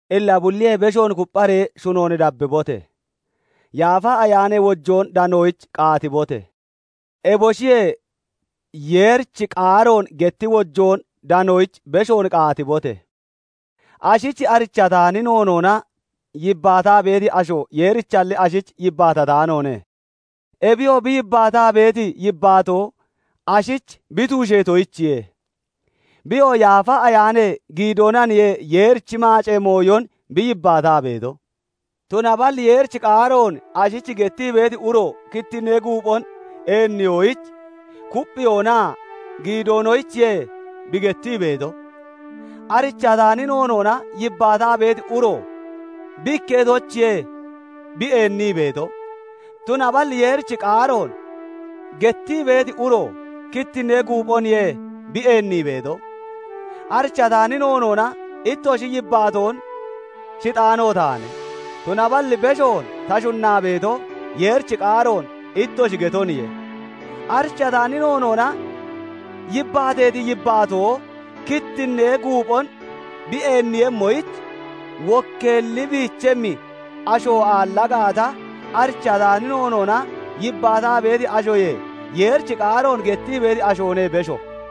Illa bulliyee beshoon kupphiiree shunoon dabbibote! Yaafa Ayaanee wojoon danoyich qaatibote! Eboshiyee Yeerichi qaaroon getti wojoon danoyich beshoon qaatibote! Ashich arichataani noonoona yibbaataa beeti asho, Yeerichalli ashich yibbaatataanoone; ebiyoo bi yibbaataa beeti yibbaatoo ashich bi tuusheetoyichiye; biyoo Yaafa Ayaanee giidoonaniye Yeerichi maacee mooyon bi yibbaataa beeto. Tunaballi Yeerichi qaaroon ashich gettii beeti uro kittinnee guuphon eenniyoyich, kupphiyoonaa goggiyoonoyichiye bi gettii beeto. Arichataani noonoona yibbaataa beeti uro bi ikketoyichiye bi eennii beeto; tunaballi Yeerichi qaaroon gettii beeti uro kittinnee guuphoniye bi eennii beeto. Arichataani noonoona ittoshi yibbaatoon shixaano taane; tunaballi beshoon ta shunnaa beeto, Yeerichi qaaroon ittoshi getoniye. Arichataani noonoona yibbaateeti yibbaatoo kittinnee guuphon bi eenniiyemmoyich, wokkeelli biichemmi asho aalla gaata, arichataani noonoona yibbaataa beeti ashoyee Yeerichi qaaroon gettii beeti ashoone besho.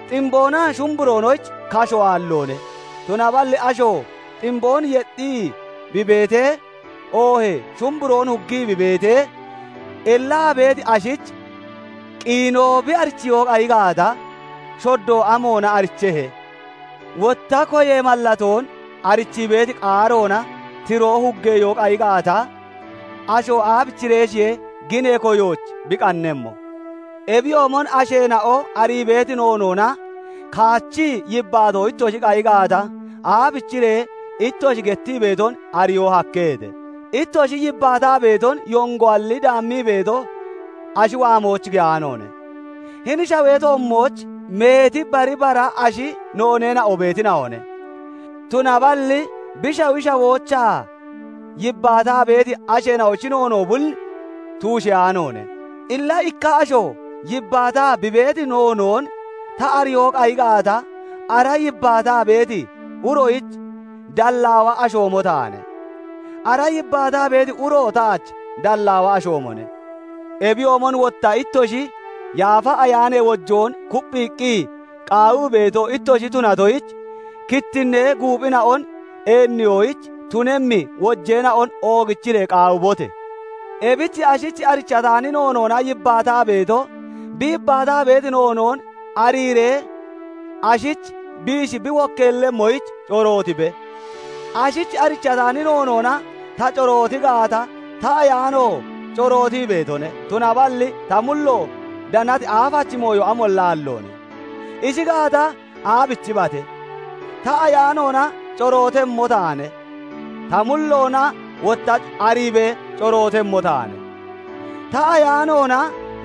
Ximboonaa shumburoonoyich kasho aalloone; tunaballi asho ximboon yexxii bi beetee, oohee shumburoon huggii bi beetee, ellaa beeti ashich qiinoo bi arichiyoo qayi gaata, shoddo amoona arichehe? Wotta koyee mallatoon arichii beeti qaaroona tiroo huggeyoo qayi gaata, asho aabichireeshiye ginee koyoyich bi qannemmo? Ebiyoomon asheena'o arii beeti noonoona kaachii yibbaato ittoshi qayi gaata, aabichiree ittoshi gettii beeton ariyoo hakkeheete? Ittoshi yibbaataa beeton yongoalli daammii beeto, ashi waamooch giyaanoone. Hini shawee toommooch meeti bari bara ashi nooneena'o beetina'one; tunaballi bi shawi shawoochaa yibbaataa beeti asheena'oyich noonoo bulli tuusheyaanoone. Illa ikka asho yibbaataa bi beeti noonoon ta ariyoo qayi gaata, ara yibbaataa beeti uroyich dallaawa ashoomo taane; ara yibbaataa beeti uro taach dallaawa ashoomone. Ebiyoomon wotta ittoshi Yaafa Ayaanee wojoon kupphiiqqi qaawii beeto ittoshi tunatoyich, kittinnee guuphina'on eenniyoyich tunemmi wojeena'on oogichiree qaawibote! Ebich ashich arichataani noonoona yibbaataa beeto bi yibbaataa beeti noonoon ariiree ashich biishi bi wokkeellemmoyich corootibe. Ashich arichataani noonoona ta corooti gaata, ta ayaano corootii beetone; tunaballi ta mullo danati aafachi mooyo amolla aalloone. Ishi gaata, aabichibate? Ta ayaanoona corootemmo taane; ta mulloona wotta ariibee corootemmo taane; ta ayaanoona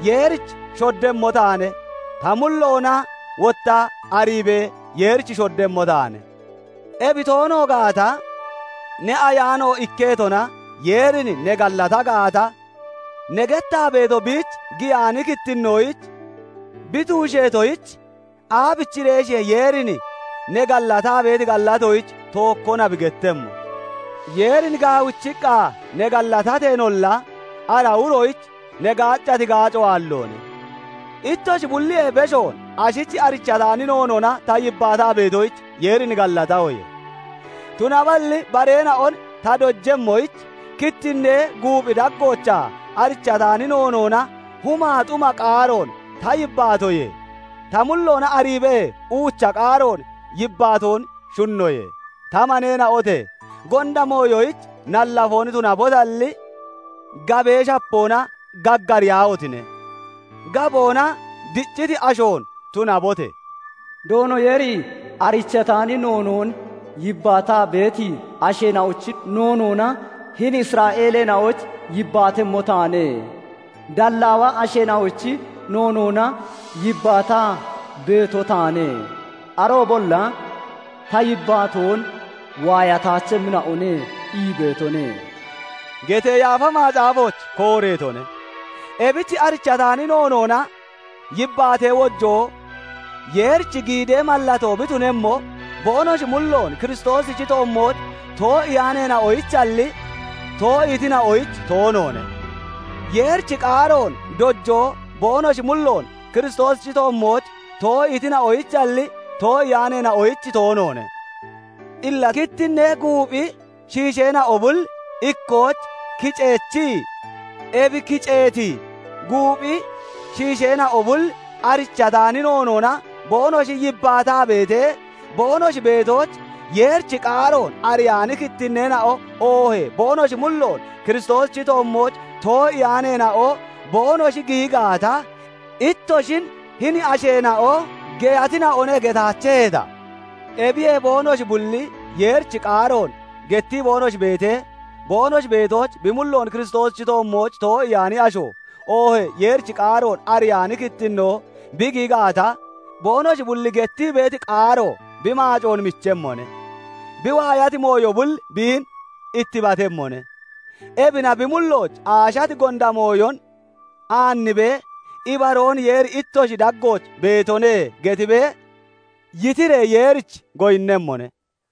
Yeerich shoddemmo taane; ta mulloona wotta ariibee Yeerich shoddemmo taane. Ebi toono gaata, ne ayaano ikketona Yeerin ne gallata gaata, ne gettaa beeto biich giyaani kittinnoyich bi tuusheetoyich, aabichireeshiye Yeerin ne gallataa beeti gallatoyich "Tookkona" bi gettemmo? Yeerin gaawichiqqa ne gallatateenolla, ara uroyich ne gaaccati gaaco aalloone. Ittoshi bulliyee beshoon ashich arichataani noonoon ta yibbaataa beetoyich, Yeerin gallatahoye; tunaballi bareena'on ta dojemmoyich, kittinnee guuphi daggoochaa arichataani noonoona humaa xuma qaaroon ta yibbaatoyee, ta mulloona ariibee uucha qaaroon yibbaatoon shunnoye. Ta maneena'ote! Gonda mooyoyich nallafoon tunabotalli, gabee shapoona gaggariyaahotine! Gaboona dicciti ashoon tunabote! "Doono Yeeri 'Arichataani noonoon yibbaataa beeti asheena'ochi noonoona hini Isra'eeleena'oyich yibbaatemmo taane; dallaawa asheena'ochi noonoona yibbaataa beeto taane; aroobolla ta yibbaatoon waayataachemmina'one' ii beetone" getee Yaafa Macaafooch kooreetone. Ebich arichataani noonoona yibbaatee wojoo Yeerichi giidee mallatoo bi tunemmo, boonoshi mulloon Kiristoosichi toommooch too'iyaaneena'oyichalli, too'iitina'oyich toonoone. Yeerichi qaaroon dojoo boonoshi mulloon Kiristoosichi toommooch too'iitina'oyichalli, too'iyaaneena'oyich toonoone. Illa kittinnee guuphi shiisheena'o bul ikkooch kiceechii, ebi kiceeti guuphi shiisheena'o bul arichataani noonoona boonoshi yibbaataa beetee, boonoshi beetooch Yeerichi qaaroon ariyaani kittinneena'o, oohee boonoshi mulloon Kiristoosichi toommooch too'iyaaneena'o boonoshi giyi gaata, ittoshin "Hini asheena'o geyatina'one" getaacheheeta? Ebiyee boonoshi bulli Yeerichi qaaroon gettii boonoshi beetee, boonoshi beetooch bi mulloon Kiristoosichi toommooch too'iyaani asho, oohee Yeerichi qaaroon ariyaani kittinnoo bi giyi gaata, boonoshi bulli gettii beeti qaaro bi maacoon michemmone; bi waayati mooyo bulli biin ittibatemmone. Ebina bi mullooch aashati gonda mooyon aannibee, "Ibaroon Yeeri ittoshi daggooch beetone" getibee yitiree Yeerich goyinnemmone.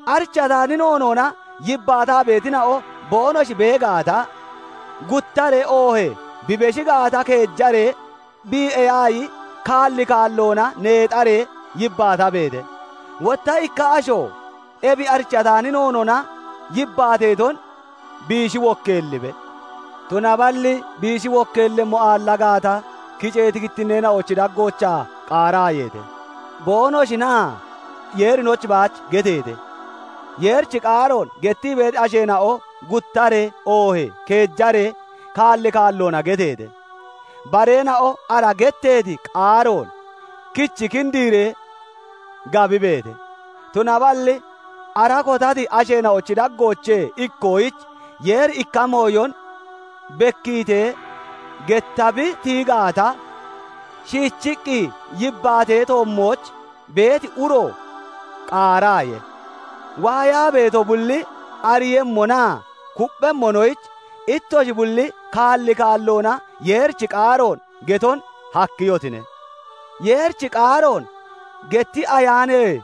Arichataani noonoona yibbaataa beetina'o boonoshi bee gaata, guttaree oohee bi beshi gaata keejaree bii'eyaayi kaalli kaalloona neexaree yibbaatabeete. Wotta ikka asho ebi arichataani noonoona yibbaateeton biishi wokkeellibe. Tunaballi biishi wokkeellemmo aalla gaata, kiceeti kittinneena'ochi daggoochaa qaaraayeete; boonoshinaa Yeerinoyich baach geteete. Yeerichi qaaroon gettii beeti asheena'o guttaree oohee keejaree kaalli kaalloona geteete; bareena'o ara getteeti qaaroon kichi kindiree gabibeete. Tunaballi ara kotati asheena'ochi daggoochee ikkoyich Yeeri ikka mooyon bekkiitee getta bi tiyi gaata, shiichiqqi yibbaatee toommooch beeti uro qaaraaye. Waayaa beeto bulli ariiyemmonaa kupphemmonoyich, ittoshi bulli kaalli kaalloona Yeerichi qaaroon geton hakkiyotine. Yeerichi qaaroon getti Ayaanee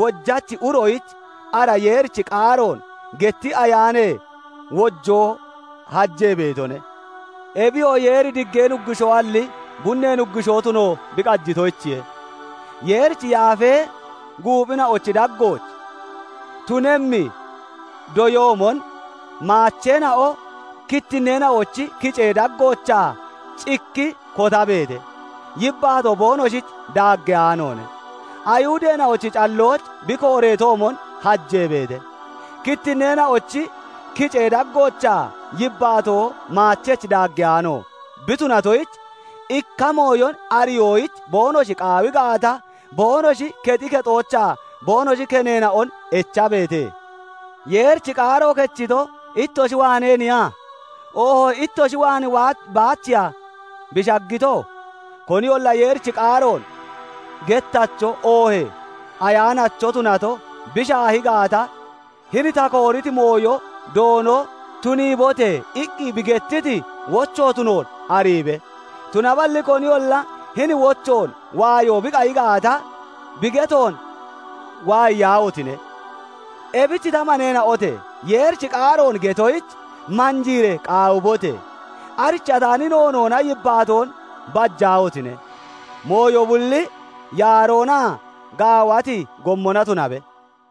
wojachi uroyich ara Yeerichi qaaroon getti Ayaanee wojoo hajee beetone. Ebiyoo Yeeri diggee Nuggushoalli, bunnee nuggushoo toono bi tunatoyichiye. Yeerichi yaafee guuphina'ochi daggooch tunemmi doyoomon, maacheena'o kittinneena'ochi kicee daggoochaa cikki kotabeete; yibbaato boonoshich daaggeyaanoone. Ayihudeena'ochi callooch bi kooreetoomon, hajeebeete. Kittinneena'ochi kicee daggoochaa yibbaato maachech daaggeyaano bi tunatoyich, ikka mooyon ariyoyich boonoshi qaawi gaata, boonoshi kexi kexoochaa boonoshi keneena'on echabeete. Yeerichi qaaro kechito, ittoshi waaneeniya? Oohee ittoshi waan baachiya bi shaggito? Koniyolla Yeerichi qaaroon gettacho, oohee ayaanacho tunato bi shaahi gaata, hini ta kooriti mooyo Doono "Tuniibote!" iqqi bi gettiti wocho tunoon ariibe! Tunaballi koniyolla hini wochoon waayo bi qayi gaata, bi getoon waayiyaahotine! Ebich ta maneena'ote! Yeerichi qaaroon getoyich, manjiiree qaawibote! Arichataani noonoona yibbaatoon bajaahotine! Mooyo bulli yaaroonaa gaawati gommona tunabe.